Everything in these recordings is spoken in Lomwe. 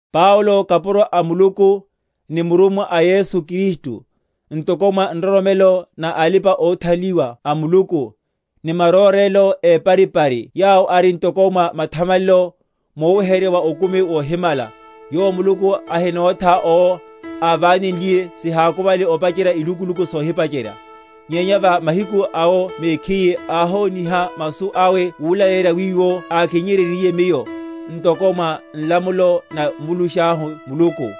Paulo, kapuro a Muluku, ni murummwa a Yesu Kristu, ntoko mwa nroromelo na alipa‐othanliwa a Muluku, ni marórela épari‐pari yawo ari ntoko mwa mathamalelo, muweheryerya wa okumi wohimala, yowo Muluku ahinótha owo, ávánenliye sihakuvale opacherya ilukuluku sohipacherya; nyenya va mahiku a Yowo mekhiye áhoniha masu awe mulaleyerya wiwo ákinnyeryenryiye miyo, ntoko mwa nlamulo na Mvulushahu Muluku: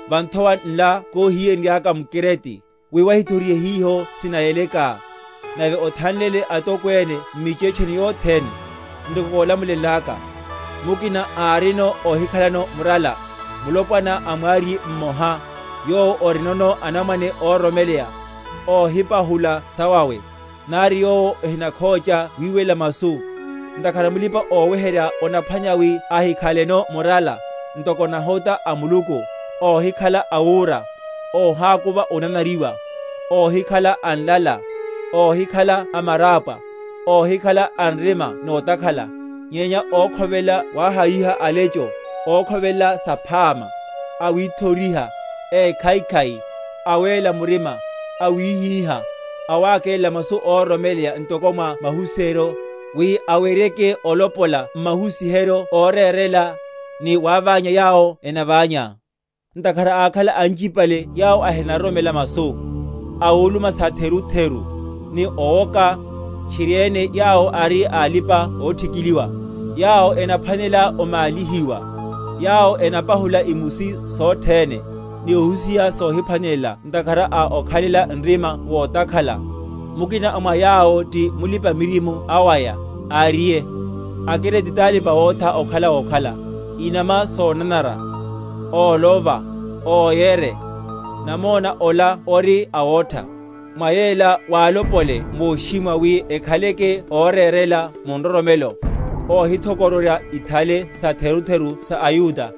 Va nthowa nla kóhiyenryaka m’Krete, wi wahithorihe hiho sinayeleka, nave othanlele atokwene m’michetcheni yothene, ntoko kólamulenlaka; mukina ári óhikhalano murala, mulopwana a mwariye mmoha, yowo orinono anamwane óroromela, óhipahula sawawe, nari yowo ohinakhócha wiwelela masu. Ntakhara mulipa‐oweherya onaphwanela wi ahikhaleno murala, ntoko nahota a Muluku; óhikhala awúra, óhákuva onanariwa, óhikhala a nlala, óhikhala a marapwa, óhikhala a nrima notakhala; nyenya ókhovelela wahayiha alecho, ókhovelela saphama, awithoriha, ékhaikhai, awéla murima, awíhíha; awákélela masu óroromeleya ntoko mwa mahusiheryo, wi aweryeke olopola m’mahusiheryo órérela, ni wáványa yawo enamvanya. Ntakhara ákhala anchipale yawo ehinaroromela masu, awuluma satherutheru, ni owoka, tchirieme yawo ari a alipa‐othikiliwa, yawo enaphwanela omálihiwa; yawo enapahula imusi sothene, ni ohusiha sohiphwanelela ntakhara a okhalela nrima wotakhala. Mukina a mwa yawo, ti mulipa‐miririmo awaya, áriye, AKrete talipa‐wotha okhala wokhala, inama sonanara, ólova, óyere. Namona ola ori awotha. Mwa yela walopole moshimwa, wi ekhaleke órérela mu nroromelo, óhithokororya ithale satherutheru sa aYuda,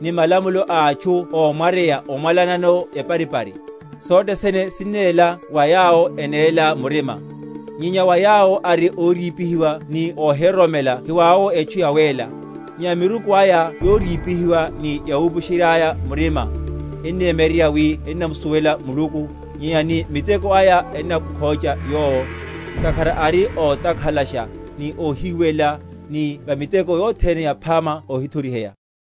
ni malamulo a atchu ómwaryeya omwalanano eparipari. Sothe sene sinnéla wa yawo enéla murima; nyenya wa yawo ari órípihiwa ni óhiroromela hiwawowo etchu yawéla; nyenya miruku aya yórípihiwa ni yawupusheryáyéne‐ya‐murima. Ennemyeryerya wi ennamusuwela Muluku, nyenya ni miteko aya ennamukhócha Yowo, ntakhara ari ótakhalasha, ni óhiwelela, ni va miteko yothene yaphama óhithoriheya.